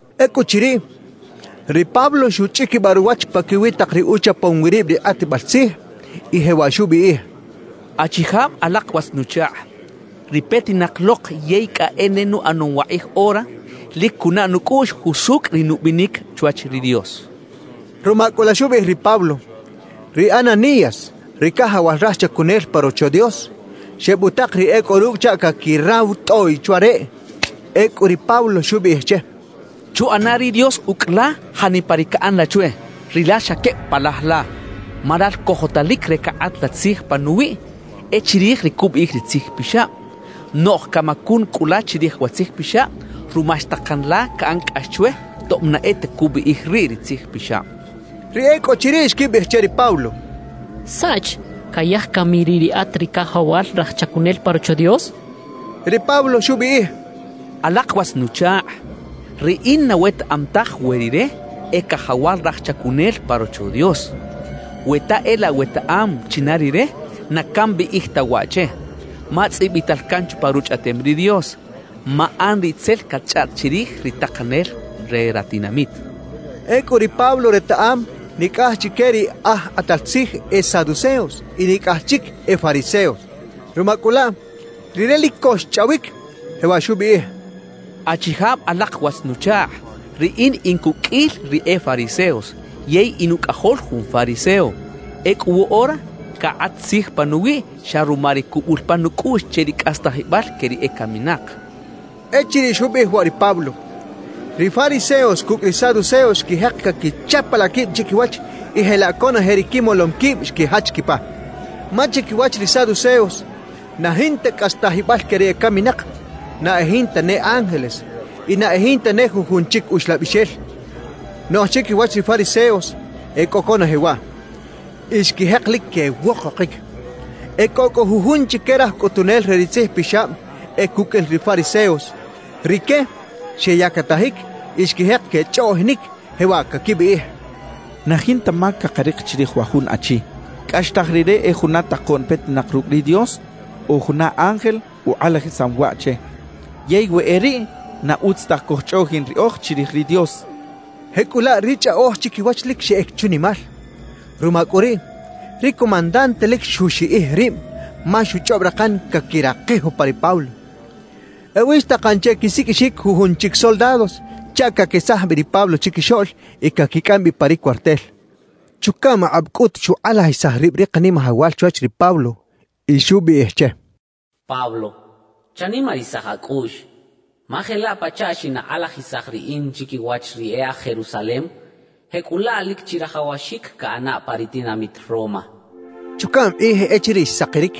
Ecꞌuchiriꞌ, ri Pablo xuchꞌiquibaꞌ ruwach paquiwi tak ri uchapom wi rib ri kꞌatbal tzij y jewaꞌ xubiꞌij: —Achijab alak watz-nuchakꞌ, ri petinak lok yey cꞌa e ne nuꞌanom wakꞌij ora, lic cunaꞌ nucꞌuꞌx jusucꞌ ri nubinic chwach ri Dios —xchaꞌ. Ruma cꞌu la xubiꞌij ri Pablo, ri Ananías ri cajawal raj chacunel pa Rocho Dios, xebutak ri e cꞌo rucꞌ chaꞌ caquiraw tꞌoꞌy chwa reꞌ. Ecꞌu ri Pablo xubiꞌij che: —¡Chuꞌana ri Dios ucꞌ la janipa ri caꞌan la chwe, rilal xa queb palaj la! Ma lal cojotalic re cakꞌat la tzij panuwiꞌ e chirij ri cubiꞌij ri Tzij Pixab; noꞌj camacun cꞌu la chirij wa Tzij Pixab ruma xtakan la caꞌan cꞌax chwe tob na e ta cubiꞌij riꞌ ri Tzij Pixab —xchaꞌ. Ri e cꞌo chiriꞌ xquibiꞌij che ri Pablo: —¿Saꞌch? ¿Cayaj cami riꞌ riꞌat ri cajawal raj chacunel pa Rocho Dios? —xechaꞌ. Ri Pablo xubiꞌij: —Alak watz-nuchakꞌ, riꞌin na wetaꞌam taj we rire e cajawal raj chacunel pa Rocho Dios. We ta e laꞌ wetaꞌam china rire, na cambiꞌij ta waꞌ che, ma tzꞌibital can chupa Ruchꞌaꞌtem ri Dios: “Maꞌan ri tzel catchꞌaꞌt chirij ri takanel re ratinamit” —xchaꞌ. Ecꞌu ri Pablo retaꞌam nicꞌaj chique ri aj kꞌatal tzij e saduceos y nicꞌaj chic e fariseos. Ruma cꞌu laꞌ, rire lic co xchꞌawic, jewaꞌ xubiꞌij: —Achijab alak watz-nuchakꞌ, riꞌin in cuqꞌuil ri e fariseos yey in ucꞌajol jun fariseo; ecꞌu woꞌora cakꞌat tzij panuwiꞌ xa ruma ri cubul pan nucꞌuꞌx che ri cꞌastajibal que ri ecaminak —xchaꞌ. Echiriꞌ xubiꞌij waꞌ ri Pablo, ri fariseos cucꞌ ri saduceos xquijek caquichapalaꞌ quib chiquiwach; y jelaꞌ conoje ri quimolom quib xquijach quipa. Ma chiquiwach ri saduceos, na jinta cꞌastajibal que ri ecaminak, na e jinta ne ángeles y na e jinta ne jujun chic uxlabixel; noꞌj chiquiwach ri fariseos, e cꞌo conoje waꞌ. Y xquijek lic quewokokic. E cꞌo cꞌu jujun chique raj cꞌutunel re ri tzijpixab e cuqꞌuil ri fariseos. Rique xeyactajic y xquijek quechꞌoꞌjinic, jewaꞌ caquibiꞌij: «Na jinta mac cakarik chirij wa jun achi. Cꞌaxtaj rire e juna takoꞌn petinak rucꞌ ri Dios o juna ángel ukꞌalajisam waꞌ che. Yey we e riꞌ, na utz taj cojchꞌoꞌjin riꞌoj chirij ri Dios» quechaꞌ. Jecꞌulaꞌ ri chꞌaꞌoj chiquiwach lic xeꞌec chunimal. Ruma cꞌu riꞌ, ri comandante lic xuxiꞌij rib, ma xuchꞌob rakan caquirakij upa ri Pablo. Ewi xtakan che quisiqꞌuixic jujun chic soldados chaꞌ caquesaj bi ri Pablo chiquixoꞌl y caquicꞌam bi pa ri cuartel. Chucaꞌm akꞌab cꞌut xukꞌalajisaj rib ri Kanimajawal chwach ri Pablo y xubiꞌij che: «Pablo, chanimarisaj acꞌuꞌx; ma jelaꞌ pachaꞌ xinakꞌalajisaj Riꞌin chiquiwach ri e aj Jerusalem, jecꞌulaꞌ lic chirajawaxic caꞌana pa ri tinamit Roma» xchaꞌ. Chucaꞌm kꞌij echiriꞌ xsakiric,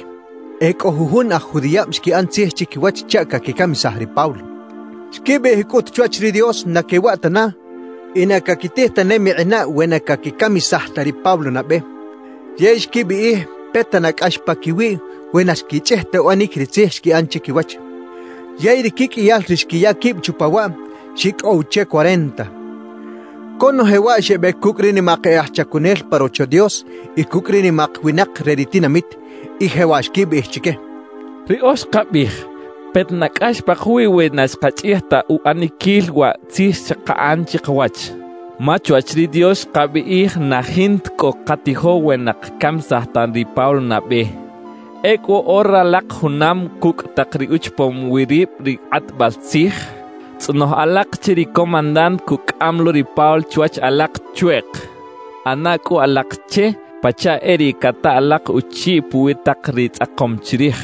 e cꞌo jujun aj judiꞌab xquiꞌan tzij chiquiwach chaꞌ caquicamisaj ri Pablo. Xquibiꞌij cꞌut chwach ri Dios na quewaꞌ tana y na caquitij ta ne mikꞌinaꞌ we na caquicamisaj ta ri Pablo nabe. Yey xquibiꞌij peta na cꞌax paquiwiꞌ we na xquichꞌij ta uꞌanic ri tzij xquiꞌan chiquiwach. Yey ri quiqꞌuiyal ri xquiya quib chupa waꞌ, xicꞌow che cuarenta. Conoje waꞌ xebec cucꞌ ri nimak e aj chacunel pa Rocho Dios y cucꞌ ri nimak winak re ri tinamit, y jewaꞌ xquibiꞌij chique: —Riꞌoj xkabiꞌij peta na cꞌax pakawiꞌ we na xkachꞌij ta uꞌaniquil wa tzij xkaꞌan chikawach. Ma chwach ri Dios xkabiꞌij na jinta cꞌo cakatijo we na cakacamisaj ta ri Pablo nabe. Ecꞌu woꞌora ralak junam cucꞌ tak ri uchapom wi rib ri kꞌatbal tzij, tzꞌonoj alak che ri comandante cucꞌam lo ri Pablo chiwach alak chweꞌk. ꞌAna cꞌu alak che pachaꞌ e riꞌ cata alak uchiꞌ puwi tak ri tzꞌakom chirij;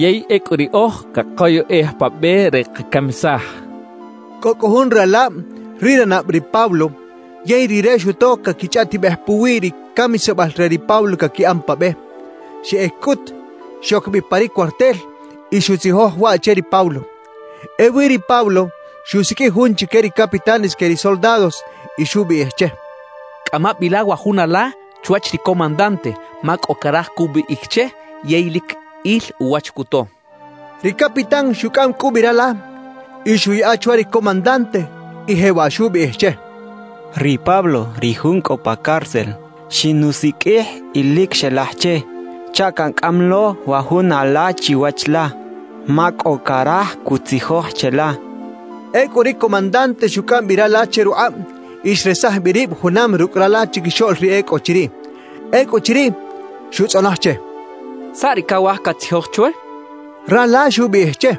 yey ecꞌu riꞌoj cakoyꞌej pa be re cakacamisaj —xechaꞌ. Cꞌo cꞌu jun ralab ri ranab ri Pablo yey rire xuto caquichꞌaꞌtibej puwi ri camisabal re ri Pablo caquiꞌan pa be. Xeꞌec cꞌut, xoc bi pa ri cuartel y xuꞌtzijoj waꞌ che ri Pablo. Ewi ri Pablo xusiqꞌuij jun chique ri capitanes que ri soldados y xubiꞌij che: —Cꞌama bi la wa jun ala chwach ri comandante, ma cꞌo caraj cubiꞌij che, yey lic il uwach cuto —xchaꞌ. Ri capitán xucꞌam cꞌu bi rala y xuꞌyaꞌa chwa ri comandante, y jewaꞌ xubiꞌij che: —Ri Pablo, ri jun cꞌo pa cárcel, xinusiqꞌuij y lic xelaj che chaꞌ cancꞌam lo wa jun ala chiwach la, ma cꞌo caraj cutzijoj cheꞌla —xchaꞌ. Ecꞌu ri comandante xucꞌam bi rala che rukꞌab y xresaj bi rib junam rucꞌ rala chiquixoꞌl ri e cꞌo chiriꞌ. Ecꞌuchiriꞌ, xutzꞌonoj che: —¿Saꞌ ri cawaj catzijoj chwe? —xchaꞌ. Rala xubiꞌij che: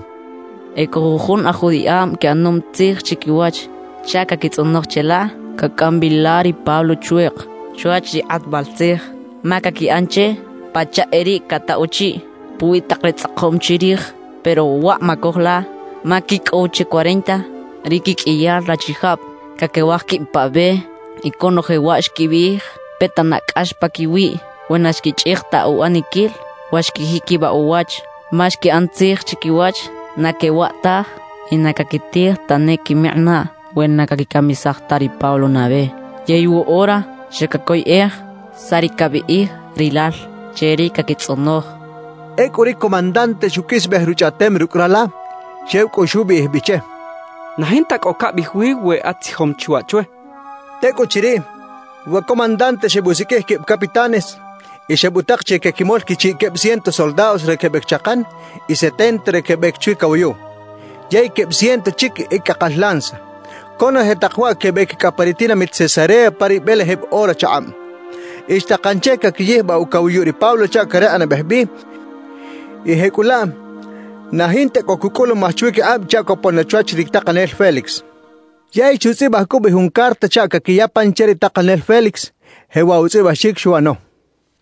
—Ecꞌo jujun aj judiꞌab quiꞌanom tzij chiquiwach chaꞌ caquitzꞌonoj cheꞌla cacꞌam bi la ri Pablo chweꞌk chwach ri kꞌatbal tzij, ma caquiꞌan che pachaꞌ e riꞌ cataꞌ uchiꞌ puwi tak ri tzꞌakom chirij. Pero waꞌ macoj la; ma quicꞌow che cuarenta ri quiqꞌuiyal rachijab caquewaj quib pa be. Y conoje waꞌ xquibiꞌij peta na cꞌax paquiwiꞌ we na xquichꞌij ta uꞌaniquil wa xquijiquibaꞌ uwach. Ma xquiꞌan tzij chiquiwach na quewaꞌ taj y na caquitij ta ne quimikꞌinaꞌ, we na caquicamisaj ta ri Pablo nabe. Yey woꞌora xa cacoyꞌej saꞌ ri cabiꞌij rilal che ri caquitzꞌonoj —xchaꞌ. Ecꞌu ri comandante xuqꞌuisbej ruchꞌaꞌtem rucꞌ rala, xew cꞌu xubiꞌij bi che: —Na jinta cꞌo cabiꞌij wi we atzijom chi waꞌ chwe —xchaꞌ. Tecꞌuchiriꞌ, wa comandante xebusiqꞌuij queb capitanes y xebutak che quequimol quichiꞌ queb ciento soldados re quebec chakan y setenta re quebec chwi cawayuꞌ; yey queb ciento chic e cꞌakal lanza. Conoje tak waꞌ quebec cꞌa pa ri tinamit Cesarea pa ri belejeb ora chakꞌab. Y xtakan che caquiyijbaꞌ ucawayuꞌ ri Pablo chaꞌ carekꞌnabej bi y jecꞌulaꞌ na jinta cꞌo cucꞌulumaj chwiquikꞌab chaꞌ copon na chwach ri takanel Félix. Yey xutzꞌibaj cꞌu bi jun carta chaꞌ caquiya pan che ri takanel Félix, jewaꞌ utzꞌibaxic xuꞌano: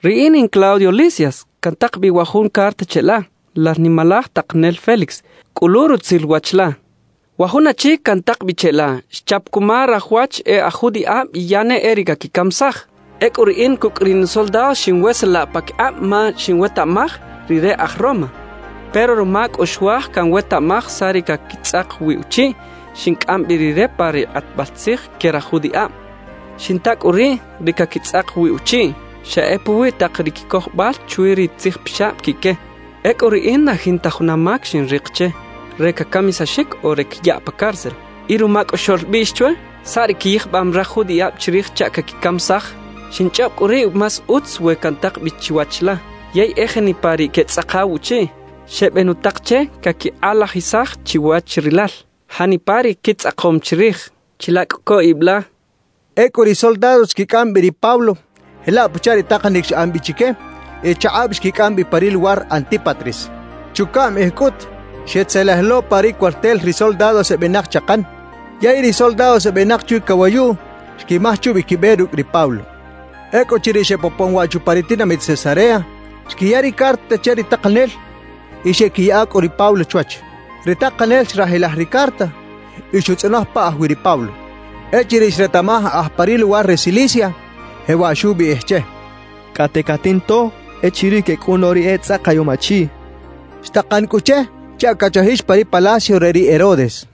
Riꞌin in Claudio Lisias, cantak bi wa jun carta cheꞌla, lal nimalaj takanel Félix. Cꞌulu rutzil wach la. Wa jun achi cantak bi cheꞌla, xchap cuma raj wach e aj judiꞌab y ya ne e riꞌ caquicamisaj. Ecꞌu riꞌin cucꞌ ri nusoldados xiꞌnweselaꞌ paquikꞌab ma xinwetaꞌmaj rire aj Roma. Pero ruma cꞌu xuaj canwetaꞌmaj saꞌ ri caquitzꞌak wi uchiꞌ, xincꞌam bi rire pa ri kꞌatbal tzij que raj judiꞌab. Xinta cꞌu riꞌ, ri caquitzꞌak wi uchiꞌ xa e puwi tak ri quicojobal chwi ri tzijpixab quiꞌque. Ecꞌu riꞌin na jinta juna mac xinrik che re cacamisaxic o re cayaꞌ pa cárcel. Y ruma cꞌu xoꞌlbiꞌx chwe saꞌ ri quiyijbam raj judiꞌab chirij chaꞌ caquicamisaj, xinchꞌob cꞌu riꞌ más utz we cantak bi chiwach la. Yey e janipa ri quetzꞌakaw uchiꞌ, xebenutak che caquikꞌalajisaj chiwach rilal janipa ri quitzꞌakom chirij. Chila cꞌu co ib la. Ecꞌu ri soldados xquicꞌam bi ri Pablo jelaꞌ pachaꞌ ri takanic xꞌan bi chique, y chakꞌab xquicꞌam bi pa ri luwar Antípatris. Chucaꞌm kꞌij cꞌut, xetzelej lo pa ri cuartel ri soldados ebenak chakan; yey ri soldados ebenak chwi cawayuꞌ, xquimaj chubi quibe rucꞌ ri Pablo. Ecꞌuchiriꞌ xebopon waꞌ chupa ri tinamit Cesarea, xquiya ri carta che ri takanel y xeꞌquiyaꞌa cꞌu ri Pablo chwach. Ri takanel xrajilaj ri carta y xutzꞌonoj pa aj wi ri Pablo. Echiriꞌ xretaꞌmaj aj pa ri luwar re Cilicia, jewaꞌ xubiꞌij che: «Cꞌate catinto echiriꞌ quecꞌun lo ri etzꞌakayom achiꞌ» xchaꞌ. Xtakan cꞌu che chaꞌ cachajix pa ri palacio re ri Herodes.